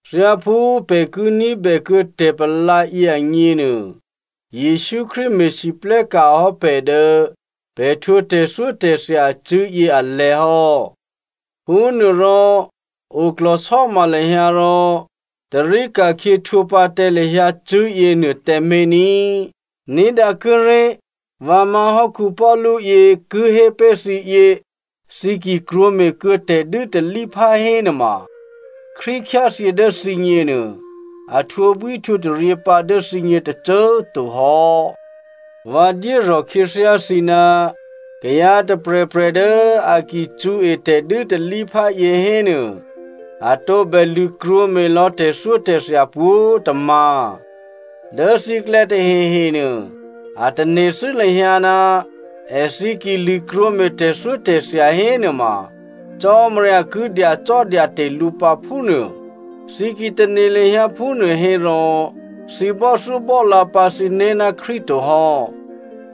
Thyáphú pè̤ ki ní̤bè kuô̌ tè̤palǎ yě agněnuô, Jesǔ Krístu me̤lwóhteka̤ hò́ pè̤ dố pè̤ htwǒ tè̤thyótè̤thya acṳ̂́ yě alè̤̌ hò́. Phúnuôrò oklò̤sò́ma lahyǎ rò tarí ka̤khyě htwǒ pǎ tǎ lahyǎ cṳ̂́ yěnuô tǎmé̤ ní꤮. Ní̤dǎ kuốré̤ vǎ má̤hò́ Paulu yě ki hé pé̤ thǐ yě, thǐ ki krwǒme̤ kuô̌ tè̤dû́talíphá hénuôma, Krístu khyáthyě dố thǐgně nuô, a htwǒbwíhtwǒtaryě pǎ dố thǐgně tôcô꤮ to hò́. Vǎ dyérò̤ khyěthyá thǐ ná kayǎ tôprè̤prè̤ dố a ki cṳ̌e tè̤dû́talíphá yěhénuô a tǒbè lṳ̂krwǒme̤ lò̌ tè̤thyótè̤thya pwǒ̤꤮ tômǎ̤. Dố thǐklè̌ tahehenuô, a tane̤thû́ lahyǎ ná èthǐ ki lṳ̂krwǒ me̤ tè̤thyótè̤thya hénuôma Cò́marya ki dyacò́dyate̤ lǔ pǎ, phúnuô. Thǐ ki tane̤ lahyǎ phúnuô hérò thǐ bò́thyóbò́lǎ pǎ thǐné̤ ná Krístu to hò́.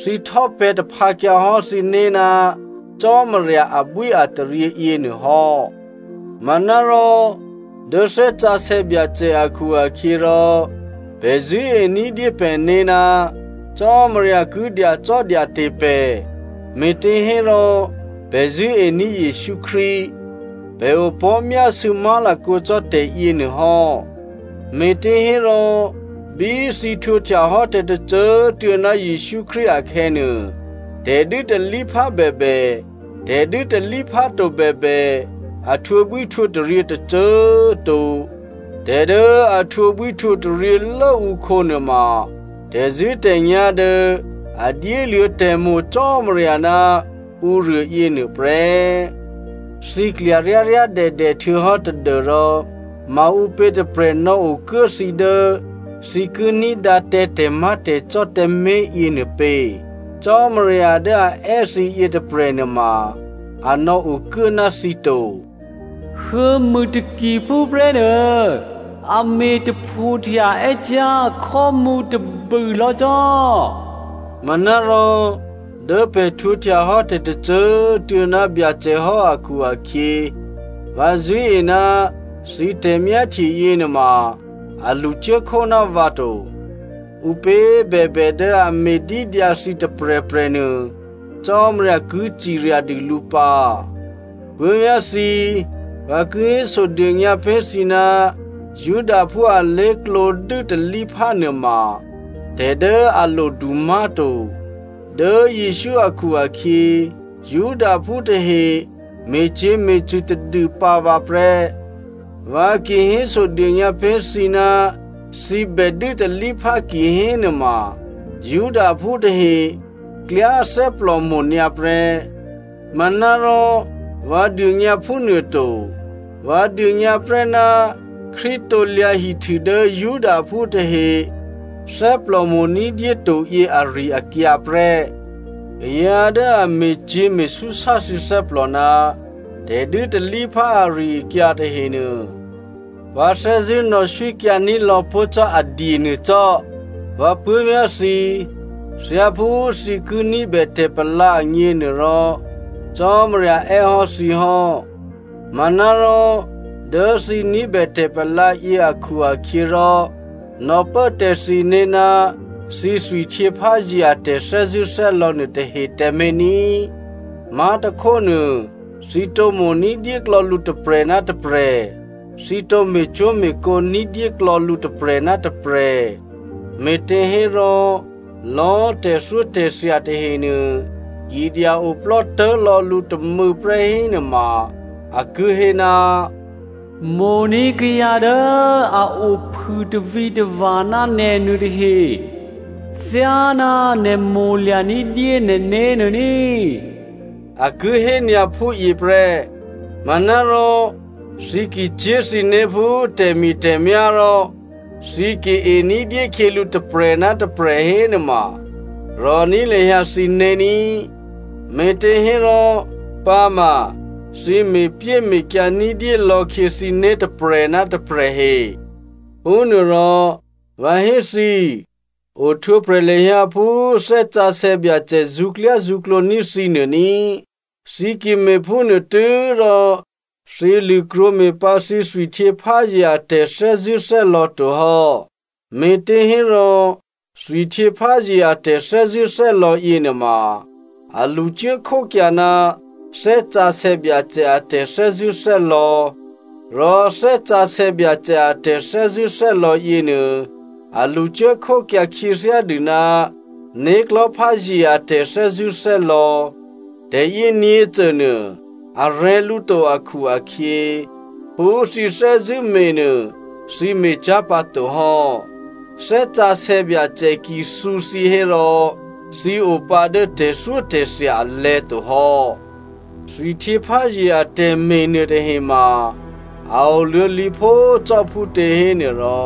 Thǐ htò́pè̤̌ taphǎkyǎhò́ thǐné̤ ná Cò́marya abwíataryě yěnuôhò́. Manárò dố Thè́ Sǎsè̌ Byacè akhu-akhyěrò, pè̤ zṳ̂́ení̤dyé pè̤né̤ ná Cò́marya ki dyacò́dyate̤ pè̤, me̤těhérò pè̤ zṳ̂́ení̤ Jesǔ Krístu. Pè̤ opò̤́myásû̌ má̤lakǒ cò́ tè̤yěnuô hò́. Me̤těhérò bí thǐ htwǒhtyahò́ tè̤tôcô꤮ tuô̌ ná Jesǔ Krístu akhè̌nuô, tè̤dû́talíphá bèbè, tè̤dû́talíphá to bèbè, a htwǒbwíhtwǒtaryě tôcô꤮ to. Tè̤ dố a htwǒbwíhtwǒtaryě lốǔkhǒ nuôma, tè̤zṳ̂́tè̤nyá̤ dố a dyéluô̌ tè̤mo̤ Cò́marya ná ǔruô yěnuô prè́. Thǐ klya ryáryádèdè htuô̌hò́ tadû́rò maǔpě tôprè̤ nò̌okuố thǐ dố thǐ ki ní̤dǎ tǎ tè̤má̤tè̤cò́ tǎmé̤ yěnuô pě? Cò́marya dố a è́ thǐ yětôprè̤ nuôma, a nò̌okuố ná thǐ to. “Huô̌mû takiphú prè́nuô a me̤ taphohtya è́cyá̤ khò́mǔ tôbûlò̌ cò́.” Manárò dố pè̤ htwǒhtyahò́ tè̤tôcô꤮ tuô̌ ná Byacè hò́ akhu-akhyě, vǎ zṳ̂́e ná thǐ tè̤myáhtye yěnuôma a lṳcuốkhó ná vǎ to. Ǔpě bèbè dố a me̤dídyǎ thǐ tôprè̤prè̤nuô, Cò́marya ki cirya dû lǔ pǎ. Puố̤vyá̤ thǐ꤮, vǎ ki hésodônyǎ pé̤ thǐ ná Judaphú alé̤klǒ dû́talíphá nuôma tè̤ dố a lodu má̤to. Dố Jesǔ akhu-akhyě, Judaphú tahe me̤cyě̤me̤cṳ̂ tadûpǎ vǎ prè́. Vǎ ki hésodônyǎ pé̤ thǐ ná thǐ bè dû́talíphá kihénuôma, Judaphú tahe klyá thè́plòmo̤ nyǎ prè́. Manárò vǎ dônyǎ phúnuôto. Vǎ dônyǎ prè́ ná Krístu krusu dố Judaphú tahe thè́plò mo̤ ní̤dyé toyě ari-akyǎ prè́. Kayǎ dố a me̤cyě̤ me̤súsá thǐ thè́plò ná tè̤dû́talíphá ari-akyǎ tahenuô, vǎ thè́zṳ̂́ nò̌swíkyǎní̤ lò̌pó̤ cò́ a dye nuô cò́. Vǎ puố̤vyá̤ thǐ꤮, thyáphú thǐ ki ní̤bè tè̤palǎ agněnuôrò, Cò́marya è́hò́ thǐ hò́. Manárò dố thǐ ní̤bè tè̤palǎyě akhu-akhyěrò, nò̌pố tǎ thǐné̤ ná thǐ thwihtyěpházye a tè̤thè́zṳ̂́thè́lò̌ nuôtahe tǎmé̤ ní꤮. Má̤tôkhónuô, thǐ tǒ mo̤ ní̤dyéklò̌ lǔ tôprè̤ ná tôprè̤, thǐ tǒ me̤cwó̤me̤kǒ ní̤dyé klò̌ lǔ tôprè̤ ná tôprè̤. Me̤těhérò lò̌꤮ tè̤thyótè̤thya tahenuô ki dya-oplò́tố̤ lò̌ lǔ tômû̌prè́ hénuôma, a ki hé, “Mo̤ní̤ kayǎ dố a o phû tavǐtava̤ ná nè̤ nuôtahe thyáná nè̤ mo̤lya̤ ní̤dyé nè̤né̤ nuô ní,” a ki hé nyǎ phúyě prè́. Manárò thǐ ki cyé̤ thǐné̤ phú tè̤mi̤tè̤myá̤ rò thǐ ki ení̤dyé khyělǔ tôprè̤ ná tôprè̤ hénuôma rò̤ní̤ lahyǎ thǐné̤ ní꤮, me̤těhérò pǎma thǐ me̤pyéme̤kyǎ ní̤dyé lò̌khyě thǐné̤ tôprè̤ ná tôprè̤ he. Phúnuôrò vǎ hé thǐ, ohtwǒprè̤ lahyǎ phú Thè́ Sǎsè̌ Byacè zṳ̌klyázṳ̌klǒ ní̤ thǐ nuô ní꤮. Thǐ ki me̤phúnuô tû́rò thǐ lṳ̂krwǒ me̤ pǎ thǐ thwihtyěpházye a tè̤thè́zṳ̂́thè́lò̌ to hò́. Me̤těhérò thwihtyěpházye a tè̤thè́zṳ̂́thè́lò̌ yěnuôma, a lṳcuố khókyǎ ná Thè́ Sǎsè̌ Byacè a tè̤thè́zṳ̂́thè́lò̌. Rò Thè́ Sǎsè̌ Byacè a tè̤thè́zṳ̂́thè́lò̌ yěnuô a lṳcuố khókyǎ khyěthyádû ná né̤klò̤́pházye a tè̤thè́zṳ̂́thè́lò̌. Tè̤yě nyě̤cônuô a rè̤̌ lǔ to akhu-akhyě, phú thǐ thè́zṳ̂́ me̤ nuô thǐ me̤cyá̤ pǎ to hò́. Thè́ Sǎsè̌ Byacè ki thǔ thǐ hérò, thǐ o pǎ dố tè̤thyótè̤thya alè̤̌ to hò́. Thwihtyěpházye atè̤me̤ nuôtahema a oluô̌lǐphó cò́ phútě hénuôrò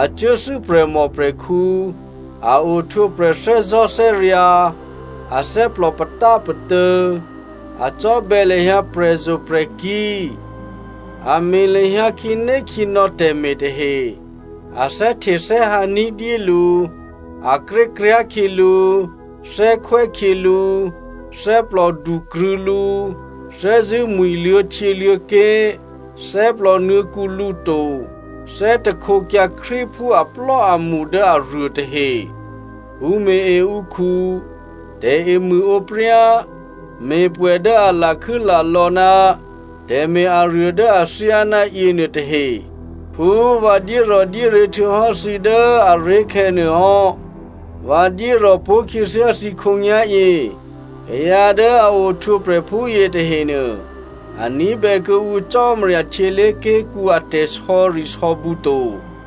a cuốthû́ prè̤mòprè̤khǔ, a ohtwǒprè̤ thè́zò̤́thè́ryǎ̤, athè́plò patápatô̌, a cò́bè̌ lahyǎ prè̤zo̤prè̤kí̤, a me̤ lahyǎ khǐnékhǐnò̌ tè̤me̤ tahe, a thè́htethè́hǎ ní̤dyé lǔ, a krékryá̤ khyělǔ, thè́khwè́ khyělǔ, thè́plòdukrṳ̂̌ lǔ, thè́zṳ̂́ mwi̤ luô̌htyěluô̌ké̤, thè́plò nuô̌kǔ lǔ to, thè́htekyǎ Krístuphú aplò́amṳ dố aruô tahe. Pṳ̌me̤-e ǔkhu, tè̤emṳ̂ǒpryá, me̤pwè̌ dố a lakhû́ lalò̌ ná tè̤me̤ aruô dố athyáná yěnuôtahe. Phú vǎ dyérò̤dyéryě̤ htuô̌hò́ thǐ dố aré̤khè̌ nuô hò́, vǎ dyérò̤ pó̤khyěthyá thǐ khǒnyá̤yě. Kayǎ dố a ohtwǒprè̤ phúyě tahenuô, a ní̤bè kuô̌ǔ Cò́marya htyělé̤ké̤kǔ a tè̤sò̌risò̌bǔ to.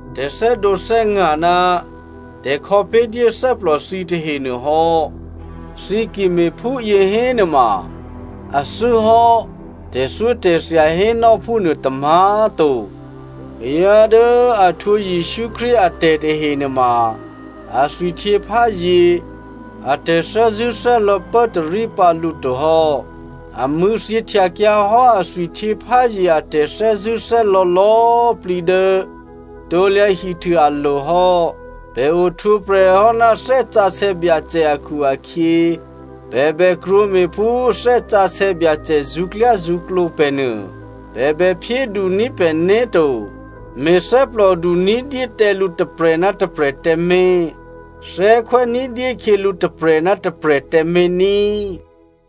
tè̤thè́dǒthè́nga̤ ná tè̤khò̌pé̤dyé thè́plò thǐ tahenuô hò́. Thǐ ki me̤phúyě hénuôma, athû́ hò́ tè̤thyótè̤thya hénò́ phúnuô tômǎ̤꤮ to. Kayǎ dố a htwǒ Jesǔ Krístu atè̤ tahe nuôma a thwihtyěpházye a tè̤thè́zṳ̂́thè́lò̌ pốtarí pǎ lǔ to hò́. A mṳ̂̌thyěhtyakyǎ hò́ a thwihtyěpházye a tè̤thè́zṳ̂́thè́lò̌ lò̌꤮ plǐ dố krusu alo̤ hò́. Pè̤ ohtwǒprè̤ hò́ ná Thè́ Sǎsè̌ Byacè akhu-akhyě pè̤ bè krwǒme̤ phú Thè́ Sǎsè̌ Byacè zṳ̌klyázṳ̌klǒ pè̤ nuô. Pè̤ bè phyéduní̤ pè̤né̤ to. Me̤thè́plòdu ní̤dyé tǎ lǔ tôprè̤ ná tôprè̤ tǎmé̤. Thè́khwè́ ní̤dyé khyělǔ tôprè̤ ná tôprè̤ tǎmé̤ ní꤮.